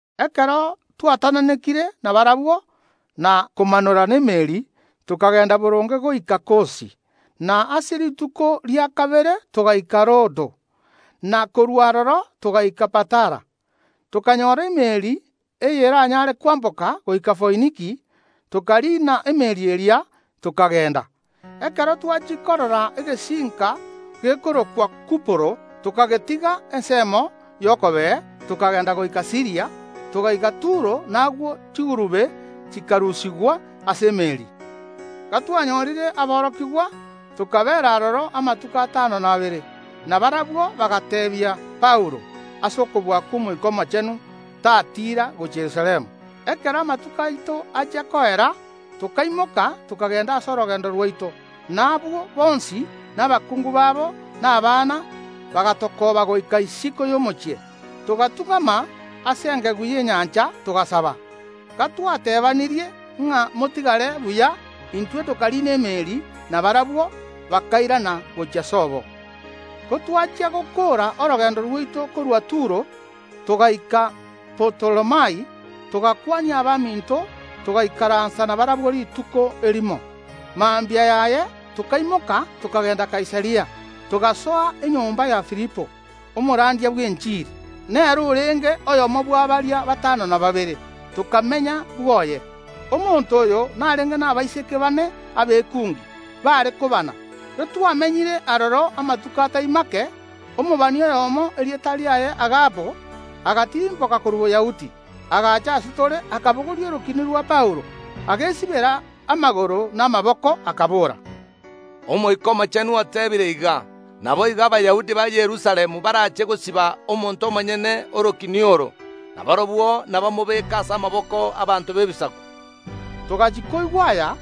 Ekero twatananekire nabarabwo na komanora n’emeeri, tokagenda boronge goika Kosi, na ase rituko ria kabere togaika Rodo, na korwa aroro togaika Patara. Tokanyoora emeeri eyeranyaare kwamboka goika Foiniki, tokariina emeeri eria, tokagenda. Ekero twachia korora egesinka gekorokwa Kuporo, tokagetiga ensemo y’okobee; tokagenda goika Siiria, togaika Turo; na agwo chigurube chikarusigwa ase emeeri. Gatwanyorire aborokigwa, tokabeera aroro amatuko atano na abere. Na barabwo bagateebia Paulo ase okobua kw’Omoika Omochenu tatiira gochia Yerusalemu. Ekero amatuko aito achia koera, tokaimoka, tokagenda ase orogendo rwaito; na abwo bonsi, na abakungu babo, na abana, bagatokooba goika isiko y’omochie; togatung’ama ase engegu y’enyancha, togasaba. Gatwatebanirie ng’a motigare buya, intwe tokariina emeeri, na barabwo bakairana gochia sobo. Gotwachia gokoora orogendo rwaito korwa Turo, togaika Tolemai, togakwania abaminto, togaikaransa nabarabwo rituko erimo. Mambia yaye tokaimoka tokagenda Kaisaria, togasoa enyomba ya Filipo, omorandia bw’enchiri. Nere orenge oyomo bwa baria batano na babere; tokamenya bwoye. Omonto oyo narenge nabaiseke bane abekungi, baare kobana. Gatwamenyire aroro amatuko atai make, omobani oyomo, erieta riaye Agabo, agatirimboka korwa Boyahudi. Agaacha ase tore, akabogoria orokini rwa Paulo, agesibera amagoro na amaboko, akabora: “Omoika Omochenu oteebire iga: Naboigo Abayahudi ba Yerusalemu barache gosiba omonto omonyene orokini oro, na barabwo nabamobeke ase amaboko ’abaanto b’Ebisaku.” Togachia koigwa aya,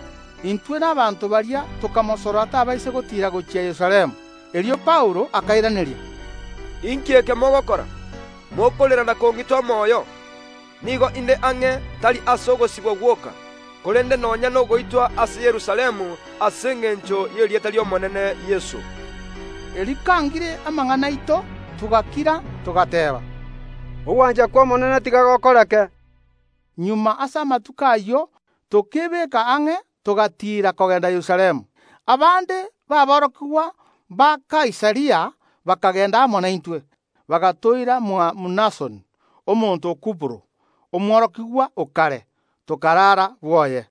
intwe na abanto baria tokamosorora tabaisa gotiira gochia Yerusalemu. Erio Paulo akairaneria: “Inki eke mogokora, mokorera na kong’ita omoyo? Nigo inde ang’e, tari ase ogosibwa gwoka, korende nonya nogoitwa ase Yerusalemu ase engencho y’erieta ri’Omonene Yeso.” Erio kangire amang’ana aito togakira togateeba: “Ogwancha kw’Omonene tiga gokoreke.” Magega ase amatuko ayio tokeebeka ang’e togatiira kogenda Yerusalemu. Abande baborokigwa ba Kaisaria bakagenda amo naintwe, bagatoira mwa Mnasoni, omonto o Kuporo, omworokigwa o kare, tokarara bwoye.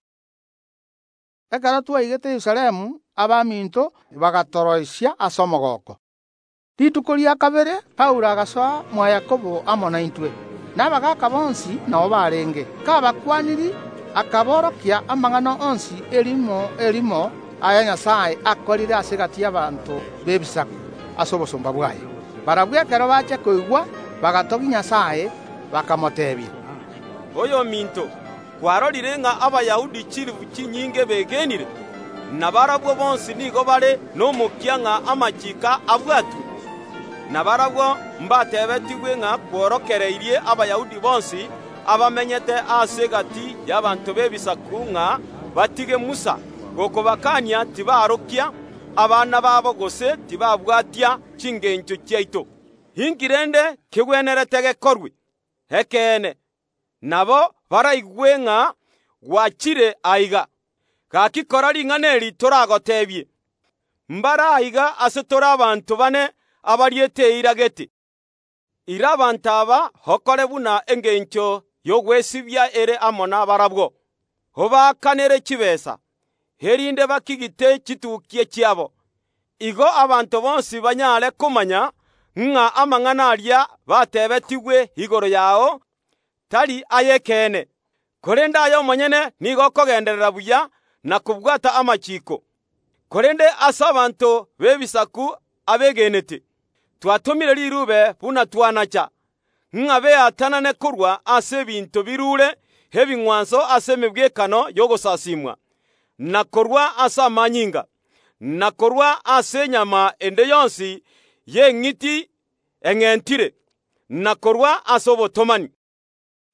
Ekero twaigete Yerusalemu abaminto bagatoroisia ase omogooko. Rituko rikobwatia Paulo agasoa mwa Yakobo amo naintwe, na abagaaka bonsi nao barenge. Kabakwanirie, akaborokia amang’ana onsi erimo erimo, aya Nyasae akorire ase egati y’abanto b’Ebisaku ase obosomba bwaye. Barabwo, ekero bachia koigwa, bagatogia Nyasae, bakamoteebia: “Oyominto, kwarorire ng’a Abayahudi chilifu chinyinge begenire; na barabwo bonsi nigo bare nomokia ng’a amachiiko abwatwe. Na barabwo mbateebetigwe ng’a kworokereirie Abayahudi bonsi abamenyete ase egati y’abanto b’Ebisaku ng’a batige Musa, gokobakania tibarokia abana babo, gose tibabwatia chingencho chiaito. Inki rende kegwenerete gekorwe? Ekeene, nabo baraigwe ng’a gwachire aiga. Gaki kora ring’ana eri toragoteebie. Mbare aiga ase tore abanto baane abariete eira gete. Ira abanto aba okore buna engencho y’ogwesibia ere amo nabarabwo, obaakanere chitaabu, erinde bakigite chitukia chiabo. Igo abanto bonsi banyare komanya ng’a amang’ana aria bateebetigwe igoro yao tari ay’ekeene, korende aye omonyene nigo okogenderera buya na kobwata amachiiko. Korende ase abanto b’Ebisaku abegenete, twatomire riruube buna twanacha, ng’a beatanane korwa ase ebinto biruure ebing’wanso ase emegwekano y’ogosasiimwa, na korwa ase amanyinga, na korwa ase enyama ende yonsi y’eng’iti eng’entire, na korwa ase obotomani.”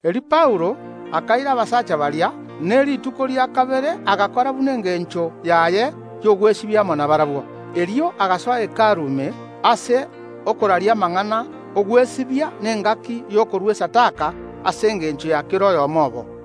Erio Paulo akaira abasacha baria, ne rituko ria kabere agakora buna engencho yare y’ogwesibia amo nabarabwo. Erio agasoa Hekalu ime, ase okoraria amang’ana ’ogwesibia na engaki y’okorua esadaka ase engencho ya kera oyomo obo.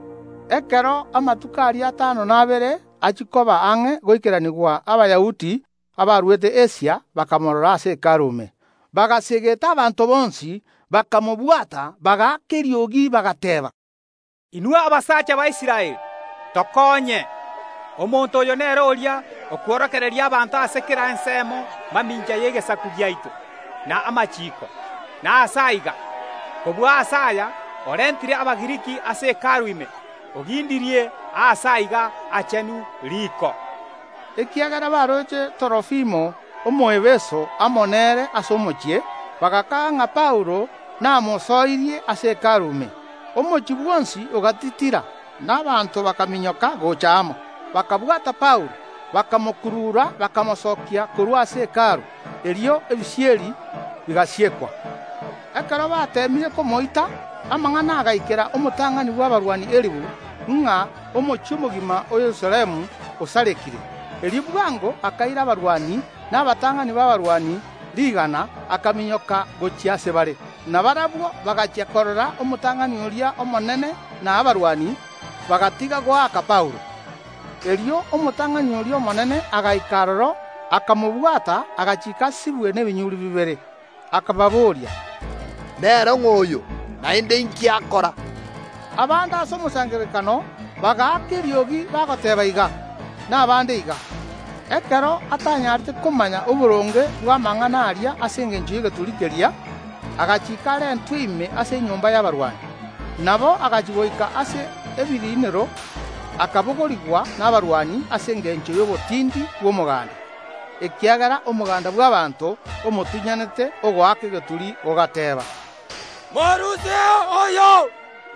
Ekero amatuko aria atano na abere achia koba ang’e goikeranigwa Abayahudi abarwete Asia bakamorora ase Hekalu ime, bagaseegeta abanto bonsi, bakamobwata, bagaaka eriogi, bagateeba: “Inwe abasacha ba Israeli, tokonye! Omonto oyo nere oria okworokereria abanto ase kera ensemo mamincha y’egesaku giaito, na amachiiko, na aase aiga. Kobua ase aya orentire Abagiriki ase Hekalu ime ogindirie Aase aiga Aachenu riko.” Ekiagera baroche Torofimo Omoefeso amo nere ase omochie, bagakaga ng’a Paulo namosoirie ase Hekalu ime. Omochie bwonsi ogatitira, na abanto bakaminyoka gocha amo, bakabwata Paulo, bakamokurura, bakamosokia korwa ase Hekalu. Erio ebisieri bigasiekwa. Ekero bateemire komoita, amang’ana agaikera omotang’ani bw’abarwani elifu ng’a omochie omogima o Yerusalemu osarekire. Erio bwango akaira abarwani na abatang’ani b’abarwani rigana, akaminyoka gochia ase bare. Na barabwo bagachia korora omotang’ani oria omonene na abarwani, bagatiga goaka Paulo. Erio omotang’ani oria omonene agaika aroro, akamobwata, agachiika asibwe nebinyuri bibere. Akababoria: “Nere ng’o oyo, naende inki akora?” Abande ase omosangererekano bagaaka eriogi bagoteeba iga, na abande iga. Ekero atanyarete komanya oboronge bw’amang’ana aria ase engencho y’egeturi keria, agachiika arentwe ime ase enyomba y’abarwani. Nabo agachia goika ase ebiriinero akabogorigwa nabarwani ase engencho y’obotindi bw’omoganda, ekiagera omoganda bw’abaanto omotunyanete, ogoaka egeturi, ogateba: “Morusieo oyo!”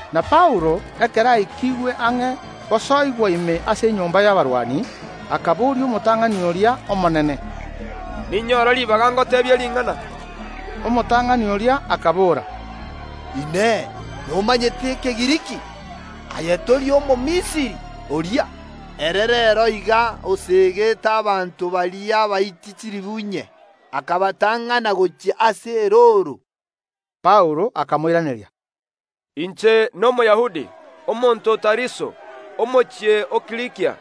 Na Paulo, ekero aikigwe ang’e gosoigwa ime ase enyomba y’abarwani, akaboria omotang’ani oria omonene: “Ninyore ribaga ngoteebie ring’ana?” Omotang’ani oria akabora: “Inee! Nomanyete Ekegiriki? Aye tori Omomisiri oria, ere reero iga oseegeta abanto baria Abaiti chilifu inye, akabatang’ana gochia ase erooro?” Paulo akamoiraneria: “Inche n’Omoyahudi, omonto o Tariso, omochie o Kilikia,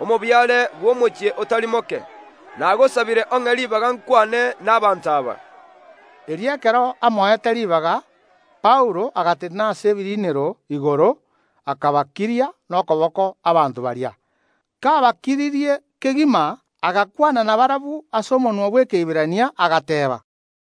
omobiare bw’omochie otari moke; nagosabire ong’e ribaga nkwane n’abanto aba.” Erio ekero amoete ribaga, Paulo agatenena ase ebiriinero igoro, akabakiria nokoboko abanto baria. Kabakiririe kegima, agakwana nabarabwo ase omonwa bw’Ekeiberania, agateeba.